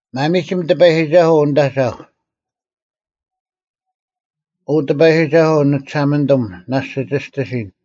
ᒪᒥᒋᒻ ᑎᐸᔨᒋᒐᓱᐤ, ᐅ ᓂᑦ ᐊᒐᐧᒄ! ᐅ ᑎᐸᔨᒋᒐᓱᐤ ᓂᒋᓴᒪᓂᑐᒻ, ᓇᔅᒡ ᒋ ᒋᔅᑎᓯᓐ: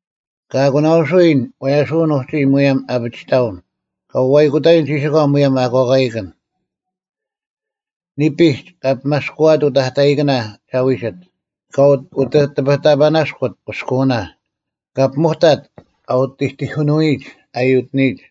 ᑲ ᐊᒂᓇᐅᓱᔨᓐ ᐛᓴᔭᐅᓐ ᐅᒋ ᒧᔭᒻ ᐊᐱᒋᑕᐅᓐ: ᑲ ᐅᐛᔨᑯᑕᔨᓐ ᒋᓯᒂ ᒧᔭᒻ ᐊᑯᐛᑲᐃᑭᓐ: ᓂᐱᒡ ᑲ ᐱᒪᔅᑯᐊᑦ ᐅᑕᑕᐃᑭᓇ ᒐ ᐎᒋᑦ: ᑲ ᐅᑎᑎᐱᑕᐸᓇᔅᑯᑦ ᑭᔅᑯᐅᓇ: ᑲ ᐱᒧᑕᑦ ᐊ ᐅᑎᑎᐧᑯᓄᐎᔨᒡ ᐊ ᔪᑎᓂᔨᒡ: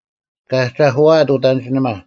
ᑲ ᐊᒐᐧᑯᐎᐊᑦ ᐅᑦ ᐊᓐᒋᓂᒪ;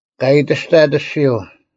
ᑲ ᐊᔨᑎᔅᑕᑦ ᐊᔅᒋᔪᐤ,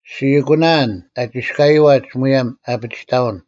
ᔅᒋ ᐊᒂᓇᐊᓐ ᐊ ᒋᔅᑲᔨᐛᒡ ᒧᔭᒻ ᐊᐱᒋᑕᐅᓐ: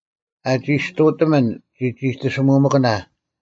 ᐊ ᒋᔅᑐᑎᒥᓐ ᒋᒋᑎᓯᒧᒥᑭᓇ;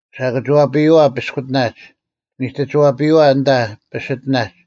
ᓴᑭᒋᐛᐱᔨᐛ ᐱᔅᑯᑎᓇᒡ, ᓂᑎᒋᐛᐱᔨᐛ ᐊᓐᑕ ᐱᓯᑎᓇᒡ,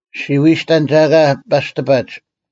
ᔅᒋ ᐎᔨᔅᑕᓐ ᒐ ᐊᑲ ᐸᔅᑎᐸᒡ;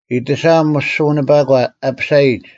ᐃᑎᓴᐊᒻ ᒧᔅᒋᐅᓂᐸᒂ ᐊ ᐱᓴᔨᒡ,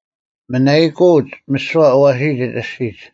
ᒥᓇᐃᑯᐅᒡ ᒥᓯᐛ ᐊᐛᓯᓯᒡ ᐊᔅᒋᒡ: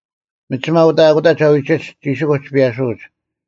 ᒥᒋᒪ ᐅᑕ ᐊᑯᑕ ᒐ ᐎᒋᒡ ᒋᓯᑯᒡ ᐱᔭᓱᐅᒡ,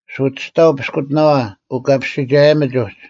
ᓱᒋᔅᑕᐤ ᐱᔅᑯᑎᓇᐛ ᐅᑲᐱᔅᒋᒐᔭᒥᒡ ᐅᒡ᙮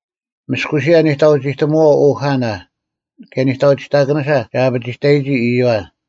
ᒥᔅᑯᓯᔭ ᓂᑕᐅᒋᑎᒧᐛᐤ ᐅᐧᑲᓇ, ᑭᔭ ᓂᑕᐅᒋᑕᑭᓂᓴ ᒐ ᐊᐱᒋᑕᔨᒋ ᐃᔪᐛ: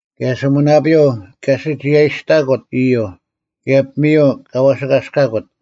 ᑭᔭ ᓱᒥᓇᐳᔪᐤ ᑲ ᓯᒋᔭᐃᑕᔅᑲᑯᑦ ᐃᔪᐤ; ᑭᔭ ᐱᒥᔪᐤ ᑲ ᐛᓯᒂᔅᑲᑯᑦ,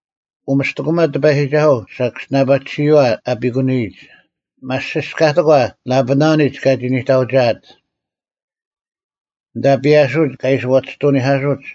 ᐅᒥᔅᑎᑯᒪ ᑎᐸᔨᒋᒐᓱᐤ ᓴᑭᔅᒋᓇᐸᒋᓯᔨᐛ ᐊᐱᑯᓂᔨᒡ: ᒪᔅᒋᔅᑲᑎᒂ ᓚᐸᓇᓂᒡ ᑲᒋ ᓂᑕᐅᒋᐊᑦ; ᐊᓐᑕ ᐱᔭᓱᐅᒡ ᑲ ᐃᓯ ᐛᒋᔅᑐᓂᐧᑲᓱᒡ: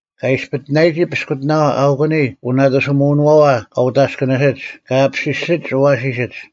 ᑲ ᐃᔅᐸᑎᓇᔨᒋ ᐱᔅᑯᑎᓇᐛ ᐊᐅᑯᓂ ᐅᓇᑕᓯᒧᐅᓄᐛᐛ ᑲ ᐅᑦ ᐊᔅᑭᓂᓯᒡ ᑲ ᐊᐱᓯᓯᒡ ᐊᐛᓯᓯᒡ,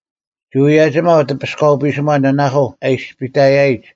ᒋ ᐅᔭᒋᒪᐤ ᑎᐱᔅᑲᐤ ᐱᓯᒺ ᓇᓇᐧᑯ ᐊ ᐊᔨᔅᐱᑕᔪᔨᒡ;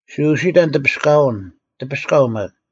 ᒋ ᐅᓯᑕᓐ ᑎᐱᔅᑲᐅᓐ, ᑎᐱᔅᑲᐤ ᒪᒃ: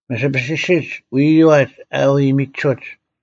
ᒥᓯᐱᓯᓯᒡ ᐎᔪᐛᒡ ᐊ ᐎ ᒥᒋᓱᒡ,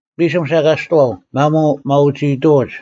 ᐱᓯᒻ ᓴᑲᔅᑐᐛᐤ; ᒪᒧᐤ ᒪᐅᒋᐃᑐᐅᒡ,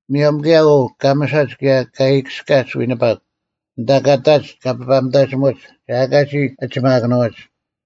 ᒧᔭᒻ ᑭᔭ ᐅ ᑲᒥᓴᒡ ᑭᔭ ᑲ ᐃᔨᑭᔅᑲᒡ ᐎᓂᐸᒄ, ᐊᓐᑕ ᑲ ᑕᒡ ᑲ ᐱᐸᒥᑕᒋᒧᒡ, ᒐ ᐊᑲ ᒋ ᐊᒋᒪᑭᓄᐎᒡ,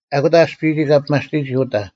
ᐊᑯᑕ ᐊᔅᐱᔨᒋ ᑲ ᐱᒪᔅᑎᒋ ᐅᐤᑕ;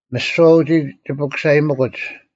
ᒥᓯᐛ ᐅᒋ ᒋ ᐱᑯᓴᔨᒥᑯᒡ;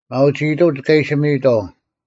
ᒪᐅᒋᑕᐅᒡ ᑲ ᐃᓯ ᒥᔨᑥᐤ: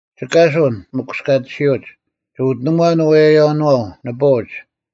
ᒋ ᑲᓱᓐ, ᒥᑯᔅᑲᑎᓯᐅᒡ, ᒋ ᐅᑎᓇᒺᓐ ᐅᔭᔭᐅᓄᐛᐤ, ᓂᐳᐅᒡ,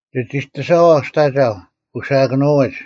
ᒋ ᒋᑎᓴᐛᐤ ᒋᑦ ᐊᒐᐧᒄ, ᐅᓯᐊᑭᓄᐎᒡ;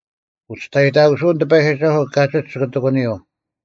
ᐅᒋᔅᑕᔨᑕᑯᓱᐅᓐ ᑎᐸᔨᒋᒐᓱᐤ ᑲᒋᒡ ᒋᑭ ᑎᒂᓂᔪᐤ: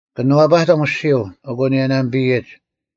ᑭᓄᐛᐸᑎᒻ ᐊᔅᒋᔪᐤ, ᐊᑯ ᓂᔭᓇᒥᐱᔨᒡ,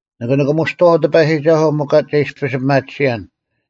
ᓂᑭ ᓂᑭᒧᔅᑐᐛᐤ ᑎᐸᔨᒋᒐᓱᐤ ᒥᒄ ᒐ ᐃᔅᐱᔅ ᐱᒪᑎᓯᔭᓐ: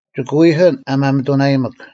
ᒋᑭ ᐎᐧᑭᓐ ᐊ ᒪᒥᑐᓇᔨᒥᒃ: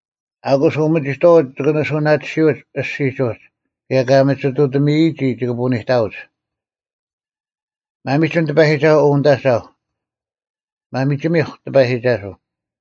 ᐊᑯᔅ ᐅᒥᒋᑥᐅᒡ ᒋᑭ ᓂᓱᐅᓇᑎᓯᐅᒡ ᐊᔅᒋᒡ ᐅᒡ, ᑭᔭ ᑲ ᒥᒋᑐᑎᒥᔨᒋ ᒋᑭ ᐳᓂᑕᐅᒡ᙮ ᒪᒥᒋᒻ ᑎᐸᔨᒋᒐᓱᐤ ᐅ ᓂᑦ ᐊᒐᐧᒄ᙮ ᒪᒥᒋᒥᐧᒄ ᑎᐸᔨᒋᒐᓱᐤ!